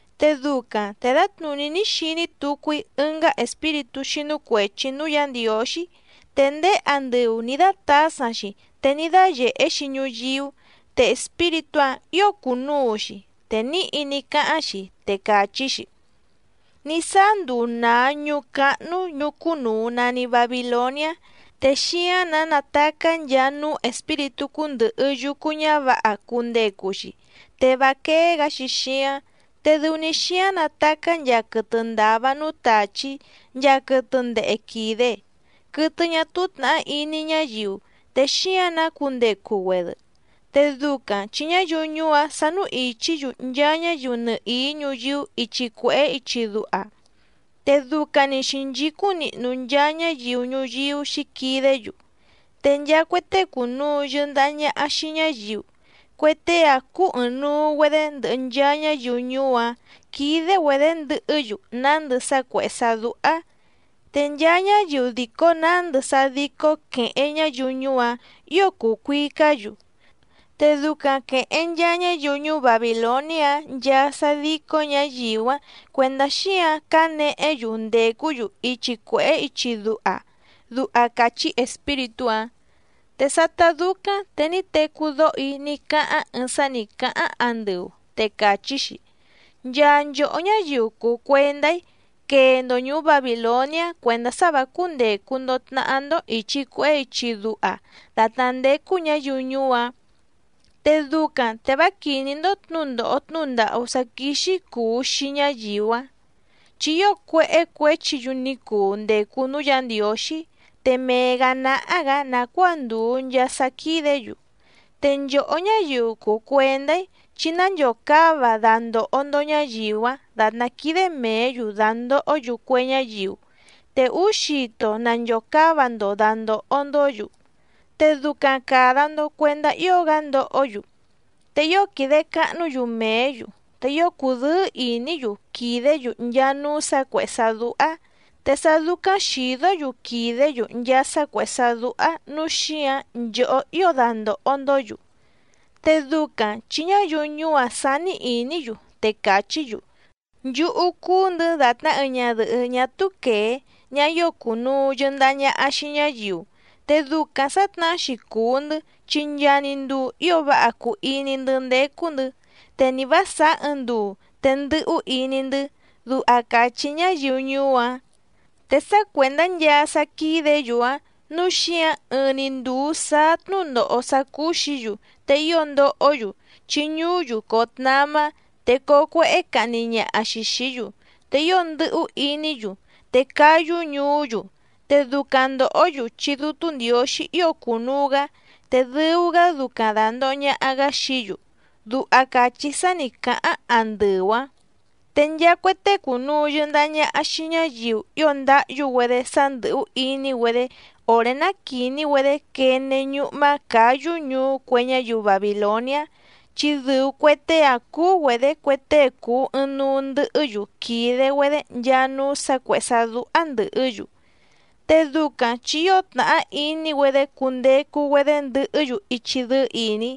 Te ducaⁿ te dǎtnùní ní xiní tucu‑í ɨngá espíritú xínú cuèchi núú Yǎ Ndiǒxí, te ndéé andɨu nì dátǎsaⁿ‑xi te ní dáyèhé‑xi ñuyíú, te espíritú‑áⁿ ǐo cùnuu‑xi. Te níhi ní cáháⁿ‑xi, te càchí‑xi: —Ní sáá nduu nàa ñuú cáhnú ñùú cúnùu nani Babiloniá, te xíáⁿ‑nǎ natacá nchaa núú espíritú cúndɨ̀hɨ yucu ñávǎha cundecu‑xi, te vá quéé‑gǎ‑xi xíáⁿ, te dɨu‑ni xíáⁿ natacá nchaa quɨtɨ ndàva núú tàchí nchaa quɨtɨ ndehe quìde, quɨtɨ ñá túú tnàhá iní ñáyiu te xíáⁿ‑nǎ cundecu‑güedɨ. Te ducaⁿ chi ñáyiu ñuú‑áⁿ sánú ìchí‑yu nchaa ñáyiu nɨhìí ñuyíú ichi cuèhé ichi duha, te ducaⁿ‑ni xǐnchícúⁿ nihnu nchaa ñáyiu ñuyíú xǐquidé‑yu, te nchaa cue tée cùnuu yɨndaha ñaha xii ñáyiu, cue tée‑áⁿ cúú ɨ̀ɨⁿnuu‑güedé ndɨhɨ nchaa ñáyiu ñuú‑áⁿ quídé‑güedě ndɨhɨ́‑yu nándɨ sá cuèhé sá dúhá. Te nchaa ñáyiu dìco nándɨ sá dícó quèheⁿ ñáyiu ñuú‑áⁿ ǐo cùu cuicá‑yu, te ducaⁿ quèheⁿ nchaa ñáyiu ñuú Babìloniá‑áⁿ nchaa sá dícó ñǎyiu‑áⁿ cuèndá xíǎⁿ cǎnehé‑yu ndècú‑yu ichi cuèhé ichi duha —duha càchí espíritú‑áⁿ. Te sátá dúcáⁿ te ní tecú dóho‑í ní cáháⁿ ɨɨⁿ sá nǐ cáháⁿ andɨu, te càchí‑xi: —Nchaa nchòhó ñáyiu cùu cuendá‑í quee‑ndo ñùú Babìloniá cuèndá sá vǎ cúndècu‑ndo tnahá‑ndó ìchi cuehé ichi duha dàtná ndécú ñǎyiu ñuú‑áⁿ, te ducaⁿ te vá quìní‑ndó tnǔndòho tnúhu ndàhú sá quíxí cùu xii ñáyiu‑áⁿ. Chi ío cuéhé cuěchi‑yu ní cuu ndècu núú Yǎ Ndiǒxí, te mee‑gǎ náhá‑gǎ nàcuáa ndùu nchaa sá quídě‑yu. Te nchòhó ñáyiu cùu cuendá‑í, chí nánchòcáva dandòho‑ndo ñáyiu‑áⁿ dàtná quídé mèé‑yu dàndohó‑yu cue ñáyiu, te úú xito nanchòcáva‑ndo dàndoho‑ndó‑yu, te ducaⁿ càda‑ndo cuendá ío‑gá ndohó‑yu. Te ío quìde cahnú‑yu mèé‑yu, te ío cùdɨ́ɨ́ ìní‑yu quìdé‑yu nchaa núú sǎ cuèhé sá dúhá, te sá dúcáⁿ xìdó‑yu quìdé‑yu nchaa sá cuèhé sá dúhá nǔu xíǎⁿ nchòhó ío dandòho‑ndó‑yu, te ducaⁿ chi ñáyiu ñuú‑áⁿ sání ìní‑yu, te càchí‑yu: “Nchúhú cúú‑ndɨ̌ dàtná ɨɨⁿ ñadɨ̀hɨ́ ñá túú quèé, ñaha ío cùnuu yɨndaha ñaha xii ñáyiu. Te ducaⁿ sǎtnahá‑xi cùu‑ndɨ́ chi nchaa‑ni nduu ío váha cùu iní‑ndɨ́ ndécú‑ndɨ̌, te ni vǎ sàá ɨɨⁿ nduu te ndɨ́hú iní‑ndɨ́”, duha càchí ñáyiu ñuú‑áⁿ. Te sá cuèndá nchaa sá quídě‑yu‑áⁿ nǔu xíǎⁿ ɨɨⁿ‑ni ndùu sáá tnúndòho sá cúú‑xǐ‑yu, te ío ndohó‑yu chi ñuú‑yu coo tnamá, te coo cuéhé cahni ñaha‑xi xìí‑yu, te ío ndɨ̀hú iní‑yu, te cáyú ñuú‑yu, te ducaⁿ ndòhó‑yu chi Dútú Ndiǒxí ío cùnuu‑gá, te dɨu‑gá ducaⁿ dàndoho ñaha‑gá xií‑yu —duha càchí sá nǐ cáháⁿ àndɨu‑áⁿ. Te nchaa cue tée cùnuu yɨndaha ñaha xii ñáyiu ío ndáhyú‑güedé sá ndɨ̀hú iní‑güedé òré ná quìní‑güedé quene ñúhmá cǎyú ñuú cue ñáyiu Babìloniá, chi dɨu cue tée‑áⁿ cúú‑güedě cue tée cùu ɨɨⁿnuu ndɨhɨ́‑yu quìde‑güedé nchaa núú sǎ cuèhé sá dúhá ndɨ̀hɨ́‑yu, te ducaⁿ chi ío tnàhá iní‑güedé cundecu‑güedé ndɨhɨ́‑yu ichi dɨ́ɨ́ ìní.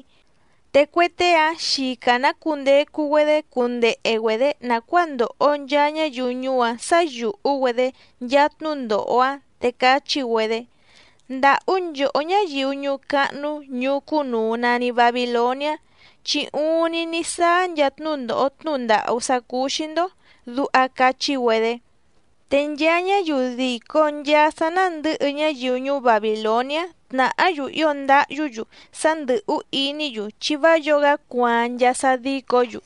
Te cue tée‑áⁿ xica‑nǎ cundecu‑güedé cundehe‑güedě nàcuáa ndoho nchaa ñáyiu ñuú‑áⁿ sǎ yùhú‑güedé nchaa tnúndòho‑áⁿ, te cachí‑güedé: —¡Ndàhú nchòhó ñáyiu ñuú cáhnú ñùú cúnùu nani Babiloniá! Chi uuⁿni ní sáá nchaa tnúndòho tnúhu ndàhú sá cúú‑xí‑ndó —duha cachí‑güedé. Te nchaa ñáyiu dìco nchaa sá nándɨ̌hɨ ñáyiu ñuú Babìloniá tnàhá‑yu ío ndáhyú‑yu sá ndɨ̀hú iní‑yu chi vá yǒo‑gá cuaaⁿ nchaa sá dícǒ‑yu.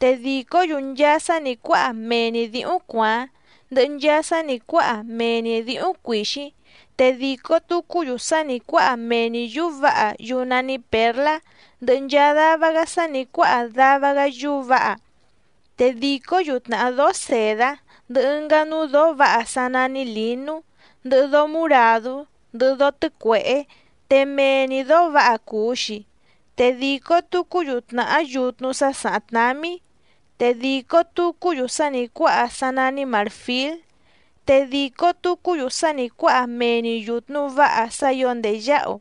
Te dìcó‑yu nchaa sá nǐ cuáha mee‑ni dǐhúⁿ cuàáⁿ, ndɨhɨ nchaa sá nǐ cuáha mee‑ni dǐhúⁿ cuìxíⁿ, te dìco tucú‑yu sá nǐ cuáha mee‑ni yǔú vǎha yúú nání pěrlá, ndɨhɨ nchaa dava‑gá sá nǐ cuáha dava‑gá yúú vǎha, te dìcó‑yu tnàhá dóó sèdá, ndɨhɨ ɨngá núú dǒó vǎha sá nání lǐnú, ndɨhɨ dóó muràdú, ndɨhɨ dóó tɨ́cuèhé te mee‑ni dǒó vǎha cùu‑xi, te dìco tucú‑yu tnàhá yutnu sá sàháⁿ tnámí, te dìco tucú‑yu sá nǐ cuáha sá nání màrfíl, te dìco tucú‑yu sá nǐ cuáha mee‑ni yùtnu váha sá ǐo ndèyáhu,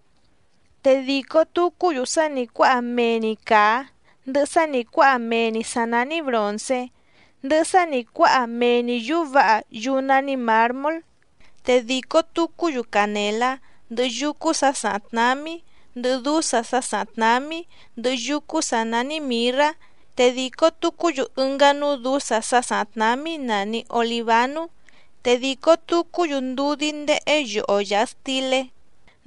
te dìco tucú‑yu sá nǐ cuáha mee‑ni càá, ndɨhɨ sá nǐ cuáha mee‑ni sǎ nání bròncé, ndɨhɨ sá nǐ cuáha mee‑ni yǔú vǎha yúú nání mǎrmól. Te dìco tucú‑yu canèlá, ndɨhɨ yúcú sǎ sàháⁿ tnámí, ndɨhɨ dúsa sá sàháⁿ tnámí, ndɨhɨ yúcú sǎ nání mìrrá, te dìco tucú‑yu ɨngá núú dǔsa sá sàháⁿ tnámí nàni olivánú, te dìco tucú‑yu ndudí ndéhé yoho yàha stilé,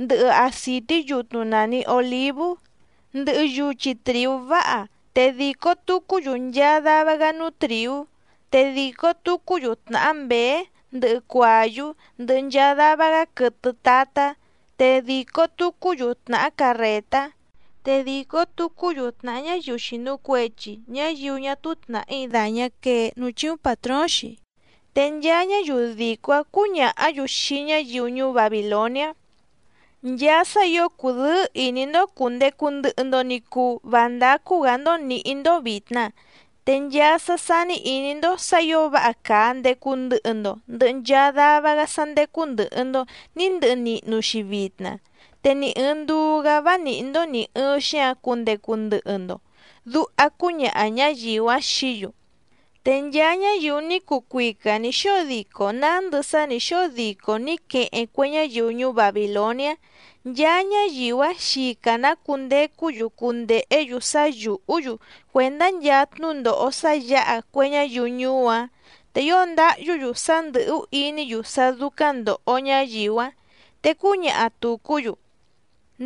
ndɨhɨ acìtí yutnu nàni olívú, ndɨhɨ yuchi trìú váha, te dìco tucú‑yu nchaa dava‑gá núú trìú, te dìcó‑yu tnàhá mběé, ndɨhɨ cuàyú, ndɨhɨ nchaa dava‑gá quɨtɨ tatá, te dìco tucú‑yu tnàhá carrètá, te dìco tucú‑yu tnàhá ñáyiu xìnu cuechi, ñáyiu ñá túú tnàhí dàñá quee núú chíúⁿ pàtróóⁿ‑xi. Te nchaa ñáyiu dìco‑áⁿ cǔñàhá‑yu xii ñáyiu ñuú Babìloniá: —¡Nchaa sá ǐo cùdɨ́ɨ́ ìní‑ndó cùndecu ndɨhɨ‑ndo ni cuu vá ndácú‑gǎ‑ndó nǐhí‑ndó vìtna, te nchaa sá sání ìní‑ndó sǎ ǐo váha càa ndecu ndɨhɨ‑ndo ndɨhɨ nchaa dava‑gá sá ndécú ndɨ̀hɨ‑ndo ní ndɨhɨ nihnu‑xi vitna, te ni ɨ̀ɨⁿ nduu‑gá vá nìhí‑ndó nì ɨɨⁿ xíǎⁿ cundecu ndɨhɨ‑ndo! —duha cúñaha ñǎyiu‑áⁿ xií‑yu. Te nchaa ñáyiu ní cuu cuica nǐ xóo dico nándɨ nchaa sá nǐ xóo dico nǐ queheⁿ cue ñáyiu ñuú Babìloniá, nchaa ñáyiu‑áⁿ xica‑nǎ cundecú‑yu cundèhé‑yu sá yùhú‑yu cuèndá nchaa tnúndòho sá yǎha cue ñáyiu ñuú‑áⁿ, te ío ndáhyú‑yu sá ndɨ̀hú iní‑yu sá dúcáⁿ ndòho ñáyiu‑áⁿ. Te cúñaha tùcú‑yu: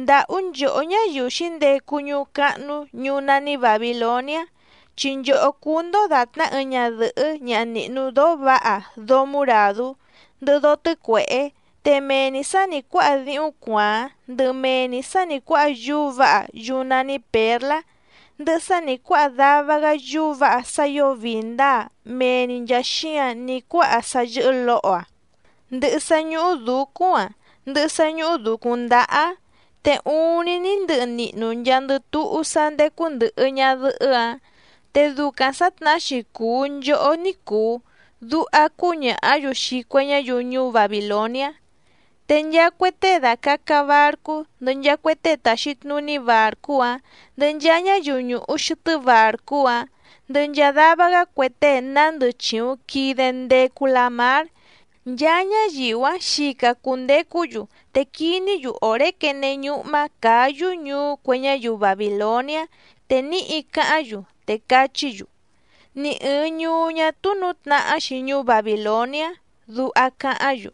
—¡Ndàhú nchòhó ñáyiu xǐndecu ñuú cáhnú ñùú nání Bàbiloniá! Chi nchòhó cúú‑ndó dàtná ɨɨⁿ ñadɨ̀hɨ́ ñaha nìhnu dóó vǎha dóó muràdú, ndɨhɨ dóó tɨ́cuèhé, te mee‑ni sǎ nǐ cuáha díhúⁿ cuàáⁿ, ndɨhɨ mee‑ni sǎ nǐ cuáha yúú vǎha yúú nání pěrlá, ndɨhɨ sá nǐ cuáha dava‑gá yúú vǎha sá ǐo vii ndǎa mee‑ni nchàa xíǎⁿ ní cuáha sá yɨ́hɨ́ lǒho‑aⁿ, ndɨhɨ sá ñúhú dǔcúⁿ‑aⁿ, ndɨhɨ sá ñúhú dǔcúⁿ ndáhá‑áⁿ. ¡Te uuⁿni ní ndɨhɨ nihnu nchaandɨ túhú sá ndécú ndɨ̀hɨ ñadɨhɨ́‑áⁿ, te ducaⁿ sǎtnahá‑xi cùu nchohó ní cùu! —duha cúñàhá‑yu xii cue ñáyiu ñuú Babìloniá. Te nchaa cue tée dàcaca barcú ndɨhɨ nchaa cue tée tàxi tnuní bàrcú‑áⁿ, ndɨhɨ nchaa ñáyiu ñùhu xɨtɨ́ bàrcú‑áⁿ, ndɨhɨ nchaa dava‑gá cue tée nándɨ chìuⁿ quide ndecu lamár, nchaa ñáyiu‑áⁿ xica cùndecú‑yu te quiní‑yu òré quene ñúhmá cǎyú ñuú cue ñáyiu Babìloniá, te níhi cáháⁿ‑yu, te cachí‑yu: —Ni ɨ̀ɨⁿ ñuú ñá túú nǔtnahá‑xi ñuú Babìloniá —duha cáháⁿ‑yu.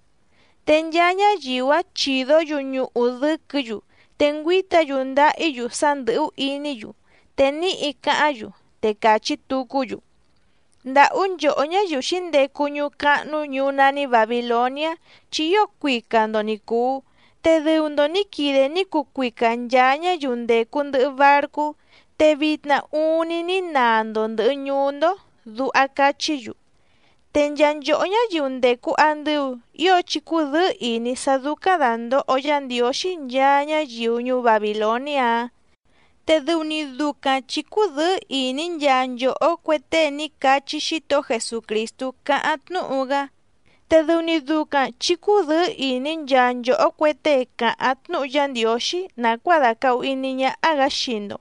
Te nchaa ñáyiu‑áⁿ chìdó‑yu ñuhu dɨ́quɨ̌‑yu, te ngüíta‑yu ndáhí‑yu sá ndɨ̀hú iní‑yu, te níhi cáháⁿ‑yu, te cachí tucú‑yu: —¡Ndàhú nchòhó ñáyiu xǐndecu ñuú cáhnú ñùú nání Bàbiloniá! Chi ío cuica‑ndo ni cùu, te dɨu‑ndo nǐ quide ní cuu cuica nchàa ñáyiu ndècu ndɨhɨ barcú, te vitna uuⁿni ní naa‑ndo ndɨ̀hɨ ñuú‑ndó —duha cachí‑yu. Te nchaa nchòhó ñáyiu ndècu andɨu ío chí cúdɨ̌ɨ́ ìní sá dúcáⁿ dàndoho Yá Ndiǒxí nchaa ñáyiu ñuú Babìloniá‑áⁿ, te dɨu‑ni ducaⁿ chǐ cúdɨ̌ɨ́ ìní nchaa nchòhó cue tée ní cachí Xítohó Jesucrìstú cáháⁿ tnúhu‑gá, te dɨu‑ni ducaⁿ chǐ cúdɨ̌ɨ́ ìní nchaa nchòhó cue tée càháⁿ tnúhu Yá Ndiǒxí nàcuáa dàcahu iní ñáhá‑gǎ xii‑ndo,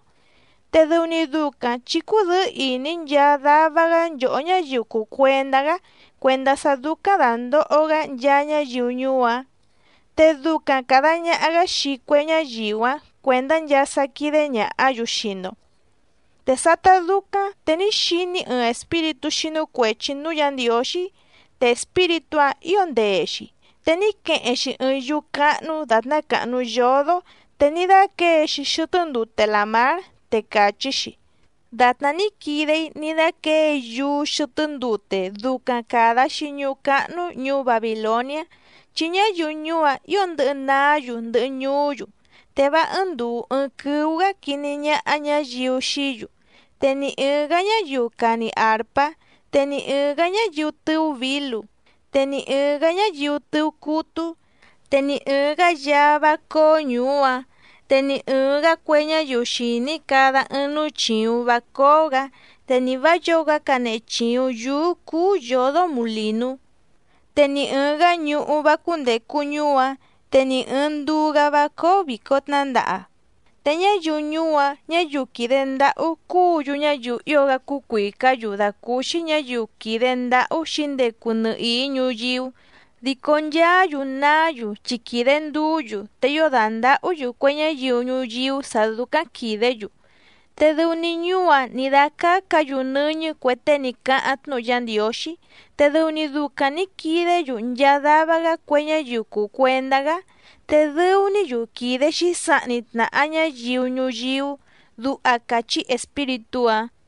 te dɨu‑ni ducaⁿ chǐ cúdɨ̌ɨ́ ìní nchaa dava‑gá nchòhó ñáyiu cùu cuendá‑gá cuèndá sá dúcáⁿ dàndoho‑gá nchaa ñáyiu ñuú‑áⁿ. Te ducaⁿ càda ñaha‑gá xii cue ñáyiu‑áⁿ cuèndá nchaa sá quídé ñàhá‑yu xii‑ndo. Te sátá dúcáⁿ te ní xiní‑í ɨɨⁿ espíritú xínú cuèchi núú Yǎ Ndiǒxí, te espíritú‑áⁿ ǐo ndee‑xi te ní queheⁿ‑xi ɨɨⁿ yúú cáhnú dàtná càhnu yódó te ní dáquěe‑xi xɨtɨ́ ndute làmár, te càchí‑xi: —Dàtná ní quide‑í ní dáquěe‑í yúú xɨtɨ́ ndute ducaⁿ càda‑xi ñuú cáhnú ñùú Babìloniá, chi ñáyiu ñuú‑áⁿ ǐo ndɨ̌hɨ naá‑yu ndɨhɨ ñuú‑yu, te vá ɨ́ɨ́ⁿ ndùu ɨɨⁿ quɨ́ú‑gǎ quiní ñáhá ñǎyiu xií‑yu. Te ni ɨ̀ɨⁿ‑gá ñáyiu càni arpá, te ni ɨ̀ɨⁿ‑gá ñáyiu tɨ̀ú vǐlu, te ni ɨ̀ɨⁿ‑gá ñáyiu tɨ̀ú cútú, te ni ɨ̀ɨⁿ‑gá yaá vá cóó ñùú‑áⁿ, te ni ɨ̀ɨⁿ‑gá cue ñáyiu xìní cada ɨɨⁿ núú chìuⁿ vá cóó‑gǎ, te ni vǎ yǒo‑gá canehe chìuⁿ yúú cúú yǒdó mulìnú. Te ni ɨ̀ɨⁿ‑gá ñuhú vá cúndècu ñuú‑áⁿ, te ni ɨ̀ɨⁿ nduu‑gá vá cóó vìco tnándaha, te ñáyiu ñuú‑áⁿ ñǎyiu quìde ndáhú cúǔ‑yu ñáyiu ío‑gá cuìcá‑yu dàcúúxí ñǎyiu quìde ndáhú xǐndecu nɨhìí ñuyíú, dico nchaá‑yu naá‑yu chi quìde nduú‑yu te ío dàndahú‑yu cue ñáyiu ñuyíú sǎ dúcáⁿ quìdé‑yu. ’Te dɨu‑ni ñuú‑áⁿ nǐ dácácǎ‑yu nɨ́ñɨ́ cue tée ní cáháⁿ tnúhu Yá Ndiǒxí, te dɨu‑ni ducaⁿ nǐ quidé‑yu nchaa dava‑gá cue ñáyiu cùu cuendá‑gá, te dɨu‑ní‑yu quìde xísahni tnàha ñáyiu ñuyíú —duha càchí espíritú‑áⁿ.